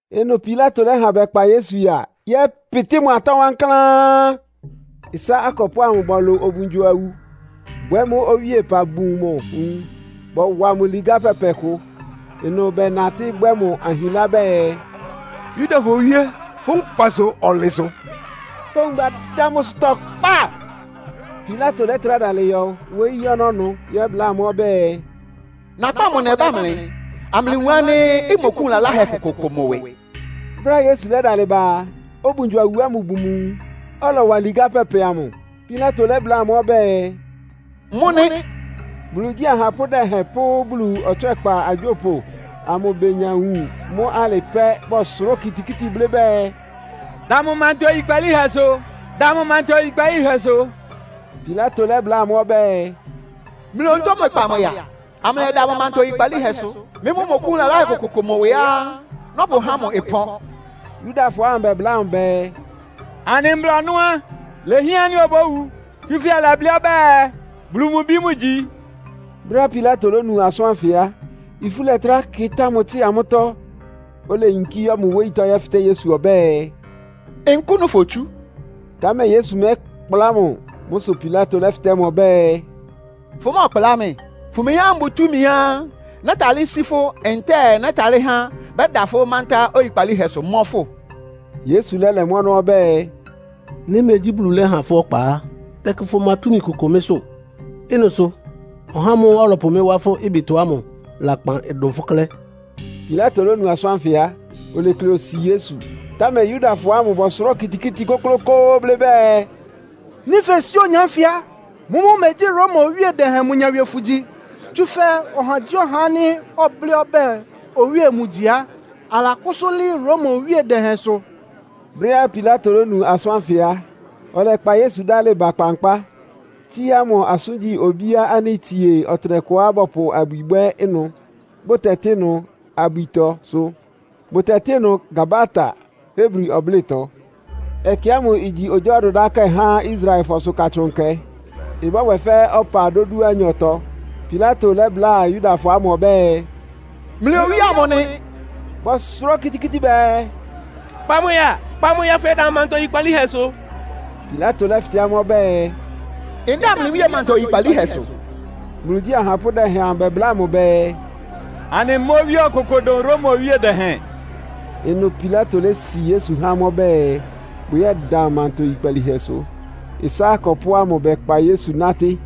Ɩnʋ Pilato lɛ́ha bɛkpa Yesu ya, yɛ́pɩtɩ́ mʋ atɔ́ wankláán. Ɩsá akɔpʋ́ ámʋ bɔlʋ obungyo-awu, bwɛ́ mʋ́ owíepa bun mʋ nwun, bɔwa mʋ ligá pɛpɛ kʋ. Ɩnʋ bɛnatɩ́ bwɛ́ mʋ ahinlá bɛɛ, “Yudafɔ Owíe, fʋ́ nkpasʋ ɔnlɩnsʋ!” Fówun badá mʋ ɩsʋtɔ kpa. Pilato lɛ́trá dalɩ yɔ wóyí ɔnɔ́ ɩnʋ yɛ́bláa amʋ́ ɔbɛ́ɛ, “Nakpá mʋ nɛba mlɩ, amlɩwun ánɩ́ mmɔkʋ́wun lalahɛ kʋkʋ mʋ ɩwɩ.” Brɛ́á Yesu lɛ́dalɩ ba a, obungyo-awu ɩpa ámʋ bun mʋ nwun, ɔlɔwa ligá pɛpɛ amʋ. Pilato lɛ́bláa amʋ́ ɔbɛ́ɛ, “Mʋ nɩ!” Bulu igyí ahapʋ́ dɛhɛn pʋ́ Bulu ɔtswɛ́kpa agyópʋ amʋ benya wun mʋ pɛ́, bɔsʋrá okitikíti blɩ́ bɛɛ, “Da mʋ manta oyikpalíhɛsʋ! Da mʋ manta oyikpalíhɛsʋ!” Pilato lɛ́bláa amʋ́ ɔbɛ́ɛ, “Mlɩ onutó mlɩkpa mʋ ya, amlɩyɛda mʋ manta oyikpalíhɛsʋ. Mɩ́ mʋ́ mmɔkʋ́wun lalahɛ kʋkʋ mʋ ɩwɩá nɔ́pʋhá mʋ ɩpɔ́n.” Yudafɔ ámʋ bɛbláa mʋ bɛɛ, “Anɩ mbla ɔnɔ́ á, ilehián ánɩ́ obówu. Tsúfɛ́ ɔlɛblɩ́ ɔbɛ́ɛ, Bulu mʋ Bi mʋgyi.” Brɛ́á Pilato lónu asʋ́n ánfɩ á, ifú lɛ́trá kɩtá mʋ tsɩ́a mʋ́tɔ́. Oleyinkí yɔ́ mʋ wóyítɔ́ yɛ́fɩtɛ́ Yesu ɔbɛ́ɛ, “Nkʋ́nʋ́ fotsú?” Támɛ Yesu mɛ́kpla mʋ. Mʋ́ sʋ Pilato lɛ́fɩtɛ́ mʋ ɔbɛ́ɛ, “Fʋmɛ́ɛkplá mɩ́? Fʋmeyín ánɩ́ mbʋ túmiá nɛ́talɩ́ sí fʋ́ ntɛ́ɛ nɛ́talɩ́ há bɛda fʋ́ mántá oyikpalíhɛsʋ mɔ́ fʋ́?” Yesu lɛ́lɛ mʋ́ ɔnɔ́ ɔbɛ́ɛ, “Nɩ́ megyí Bulu lɛ́ha fʋ́ ɔkpa á, tɛkɩ fʋma túmi kʋkʋ mɩ́sʋ́. Ɩ́nɩ sʋ ɔhá ámʋ́ʋ́ ɔlɔpʋ mɩ́ wá fʋ́ ɩbɩtɔ ámʋ lakpan dʋn fʋ́ klɛ́.” Pilato lónu asʋ́n ánfɩ á, olekle osi Yesu. Támɛ Yudafɔ ámʋ bɔsʋrá okitikíti kʋ́klʋ́kʋ́ʋ́ blɩ́ bɛɛ, “Nɩ́ fesi ɔhá ánfɩ á, mʋ́mʋ́ megyí Roma owíe dɛhɛn mʋ nyawie fʋgyi. Tsúfɛ́ ɔhagyíɔha ánɩ́ ɔblɩ́ ɔbɛ́ɛ owíe mʋgyi á, alakʋ́sʋ́ lɩ́ɩ́ Roma owíe dɛhɛnsʋ!” Brɛ́á Pilato lónu asʋ́n ánfɩ á, ɔlɛkpa Yesu dálɩ ba kpankpá, tsíá mʋ asʋ́ngyí obíá ánɩ́ itsie ɔtɩnɛkʋá bɔpʋ abwi bwɛ́ ɩnʋ, bʋtɛtɩ́ ɩnʋ “Abwitɔ” sʋ. (Bʋtɛtɩ́ ɩnʋ “Gabata” Hebri ɔblɩ́tɔ.) Ɛkɛ ámʋ igyi ogyá ɔdʋdákɛ́ há Israelfɔsʋ Katsʋn Nkɛ. Ɩbɔ́bwɛ fɛ́ ɔpa dódúanyɔtɔ á, Pilato lɛ́bláa Yudafɔ ámʋ ɔbɛ́ɛ, “Mlɩ Owíe amʋ nɩ!” Bɔsʋrá okitikíti bɛɛ, “Kpa mʋ ya, kpa mʋ ya, afʋyɛda mʋ manta oyikpalíhɛsʋ.” Pilato lɛ́fɩtɛ́ amʋ́ ɔbɛ́ɛ, “Ndáa mlɩ owíe manta oyikpalíhɛsʋ?” Bulu igyí ahapʋ́ dɛhɛn amʋ bɛbláa mʋ bɛɛ, “Anɩmá owíe ɔkʋkʋ dʋn Roma owíe dɛhɛn!” Ɩnʋ Pilato lési Yesu há amʋ́ ɔbɛ́ɛ bʋyɛ́da mʋ manta oyikpalíhɛsʋ. Ɩsá akɔpʋ́ ámʋ bɛkpa Yesu nátɩ́.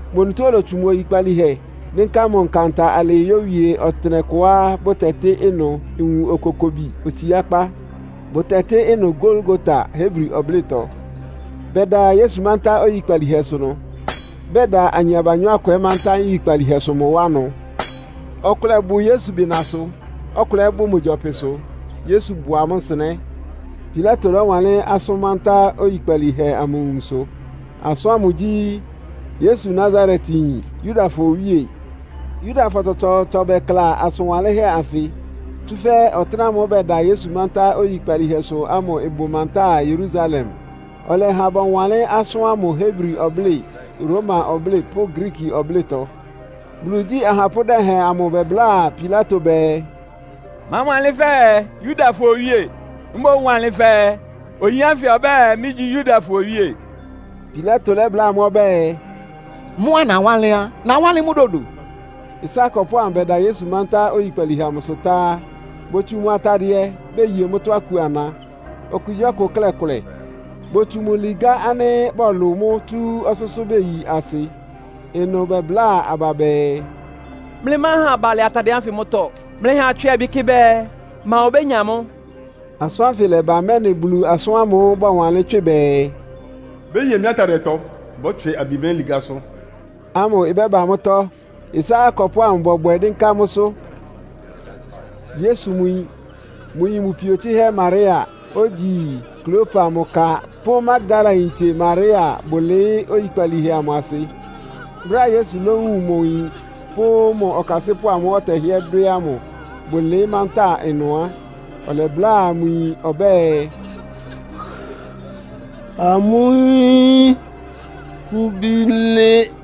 Mʋ onutó olotsu mʋ oyikpalíhɛ dɩ́nká mʋ nkanta alɩɩ yéwie ɔtɩnɛkʋá bʋtɛtɩ́ ɩnʋ “Nwun Okokobi Otsiákpá.” (Bʋtɛtɩ́ ɩnʋ “Golgota” Hebri ɔblɩ́tɔ.) Bɛda Yesu mántá oyikpalíhɛsʋ ɩnʋ, bɛda ayin abanyɔ́ akʋ ɛ́ mántá nyikpalíhɛsʋ mʋ wá ɩnʋ. Ɔkʋlɛ bʋ Yesu bɩnasʋ, ɔkʋlɛ ɛ́ bʋ mʋ gyɔpɩsʋ, Yesu bʋ amʋ́ nsɩnɛ́. Pilato lɔ́wanlɩ́n asʋ́n mántá oyikpalíhɛ amʋ awunso. Asʋ́n ámʋ gyí, “Yesu Nasaretyin, Yudafɔ Owíe.” Yudafɔ tsɔtsɔɔtsɔ bɛkla asʋn wanlɩ́nhɛ́ anfɩ. Tsúfɛ́ ɔtɩ́nɛ́ ámʋ́ʋ́ bɛda Yesu mántá oyikpalíhɛsʋ ámʋ ɩbʋ mantáa Yerusalem. Ɔlɛha bɔwanlɩ́n asʋ́n ámʋ Hebri ɔblɩ́ɩ, Roma ɔblɩ́ɩ pʋ́ Griiki ɔblɩ́tɔ. Bulu igyí ahapʋ́ dɛhɛn amʋ bɛbláa Pilato bɛɛ, “Máwanlɩ́n fɛɛ, ‘Yudafɔ Owíe.’ Mboún wanlɩn fɛɛ, ‘Oyin ánfɩ ɔbɛ́ɛ, mɩ́gyí Yudafɔ Owíe.’” Pilato lɛ́bláa amʋ́ ɔbɛ́ɛ, “Mʋ́á nawánlɩ́n á, nawánlɩ́n mʋ́ dodo.” Ɩsá akɔpʋ́ ámʋ bɛda Yesu mántá oyikpalíhɛ amʋsʋ tá á, botsu mʋ atadɩɛ, beye mʋ́tɔ́ aku ana. Okugyíɔkʋ klɛ́ kʋlɛ. Botsu mʋ ligá ánɩ́ bɔlʋ mʋ́ tsú ɔsʋ́sʋ́ beyi asɩ. Ɩnʋ bɛbláa aba bɛɛ, “Mlɩmáha abalɩ atadɩɛ ánfɩ mʋ́tɔ́. Mlɩha atswɩ abi kɩ bɛɛ, ma obénya mʋ́.” Asʋ́n ánfɩ lɛ́ba, mɛ́nɩ Bulu asʋ́n ámʋ́ʋ́ bɔwanlɩ́n tswɩ bɛɛ, “Beye mɩ́ atadɩɛtɔ, bɔtswɩ abi mɩ́ ligásʋ́” amʋ ɩbɛ́ba mʋ́tɔ́. Ɩsá akɔpʋ́ ámʋ bɔbwɛ dɩ́nká mʋ́sʋ́. Yesu mʋ yin, mʋ yin mʋ pio tsɩ́hɛ́ Maria, ogyi Klopa mʋ ka pʋ́ Magdalayintse Maria bʋlɩɩ́ oyikpalíhɛ amʋ asɩ. Brɛ́á Yesu lówun mʋ yin pʋ́ mʋ ɔkasɩ́pʋ́ ámʋ́ʋ́ ɔtɛhɩ́ɛ́ dwɛ́ ámʋ, bʋlɩɩ́ mantáa ɩnʋ á, ɔlɛbláa mʋ yin ɔbɛ́ɛ, “Amʋ́ yín, fʋ́ bí nɩ́.”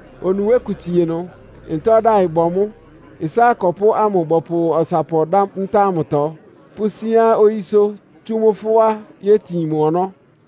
Onuwé kʋ tsie ɩnʋ, ntá ɔdáɩ ɩbɔ mʋ́. Ɩsá akɔpʋ́ ámʋ bɔpʋ ɔsapɔ dá ntá ámʋtɔ pʋ́síán oyísʋ́, tsú mʋ́ fʋ́á yétin mʋ ɔnɔ́.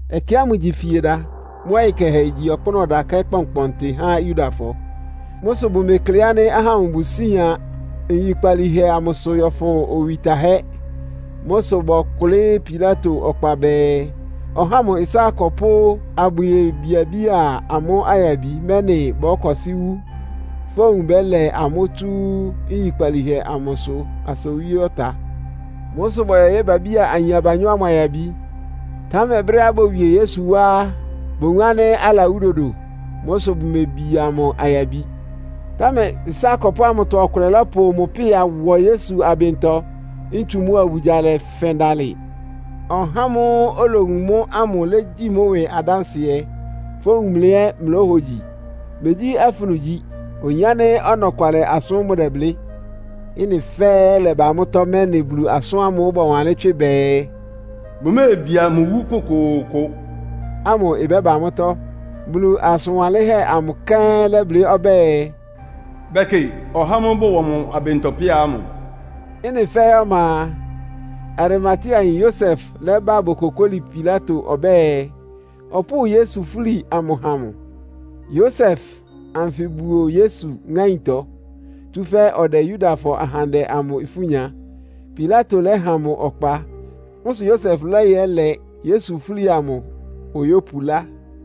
Ɛkɛ ámʋ igyi Fieda. Mʋ́ ɔyɩ kɛhɛ igyi ɔkpʋ́nʋ́ ɔdakɛ́ kpɔnkpɔntɩ há Yudafɔ. Mʋ́ sʋ bʋmekle ánɩ́ ahá ámʋ bʋsían nyikpalíhɛ amʋsʋ yɔ́fʋn owi tahɛ́. Mʋ́ sʋ bɔkʋlɩ́ Pilato ɔkpa bɛɛ ɔháa mʋ ɩsá akɔpʋ́ abʋyebiabía amʋ́ ayabi, mɛ́nɩ bɔ́kɔsɩ́ wú, fówun bɛ́lɛ amʋ́ tsu nyikpalíhɛ amʋsʋ asa owí ɔta. Mʋ́ sʋ bɔyɔ yébiabía ayin abanyɔ́ ámʋ ayabi. Támɛ brɛ́á bowie Yesu wá á, bowun ánɩ́ alawú dodo. Mʋ́ sʋ bumebia mʋ ayabi. Támɛ ɩsá akɔpʋ́ ámʋtɔ ɔkʋlɛ lɔ́pʋ mʋ pɩ́a wɔ Yesu abɩntɔ, ntsu mʋ́a obugya lɛfɛn dalɩ. (Ɔhá ámʋ́ʋ́ olowun mʋ́ ámʋ légyi mʋ́ ɩwɩ adánsɩɛ, fówun mlɩ ɛ́ mlóhogyi. Megyí afunu igyi. Oyin ánɩ́ ɔnɔkwalɩ asʋ́n mʋdɛblɩ́.) Ɩ́nɩ fɛ́ɛ́ lɛ́ba mʋ́tɔ́, mɛ́nɩ Bulu asʋ́n ámʋ́ʋ́ bɔwanlɩ́n tswɩ bɛɛ, “Bʋméebia mʋ iwú kʋkʋʋkʋ” ámʋ ɩbɛ́ba mʋ́tɔ́. Bulu asʋn wanlɩ́nhɛ́ amʋ kɛ́n lɛblɩ́ ɔbɛ́ɛ, “Bɛ́kɩ ɔhá ámʋ́ʋ́ bɔwɔ mʋ abɩntɔ pɩ́a ámʋ.” Ɩ́nɩ fɛ́ɛ́ ɔma a, Arimateayin Yosef lɛ́ba bokokóli Pilato ɔbɛ́ɛ, ɔpʋ́ʋ Yesu fúli amʋ ha mʋ. (Yosef anfɩ buo Yesu ŋáintɔ, tsúfɛ́ ɔdɛ Yudafɔ ahandɛ amʋ ifú nya.) Pilato lɛ́ha mʋ ɔkpa. Mʋ́ sʋ Yosef lɛ́yɛlɛ Yesu fúli amʋ oyópulá.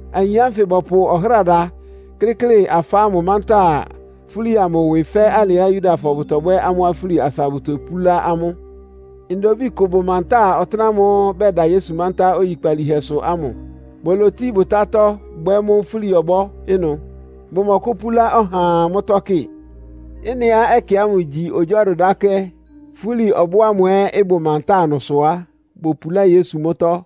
Ayin ánfɩ bɔpʋ́ ɔhráda kɩ́klɩ afá ámʋ mántá fúli amʋ ɩwɩ fɛ́ alɩá Yudafɔ bʋtɔbwɛ́ amʋ́ afúli asa bʋtopúlá amʋ́. Ndobíi kʋ ɩbʋ mantáa ɔtɩ́nɛ́ ámʋ́ʋ́ bɛda Yesu mántá oyikpalíhɛsʋ ámʋ. Bolotí bʋtátɔ́ bwɛ́ mʋ́ fúli-ɔbɔ́ ɩnʋ. Bʋmɔkʋ́púlá ɔhaa mʋ́tɔ́ kɩ. Ɩ́nɩá ɛkɛ ámʋ igyi ogyá ɔdʋdákɛ́, fúli ɔbɔ́ ámʋ ɛ́ ɩbʋ mantáa ɩnʋ sʋ á, bopulá Yesu mʋ́tɔ́.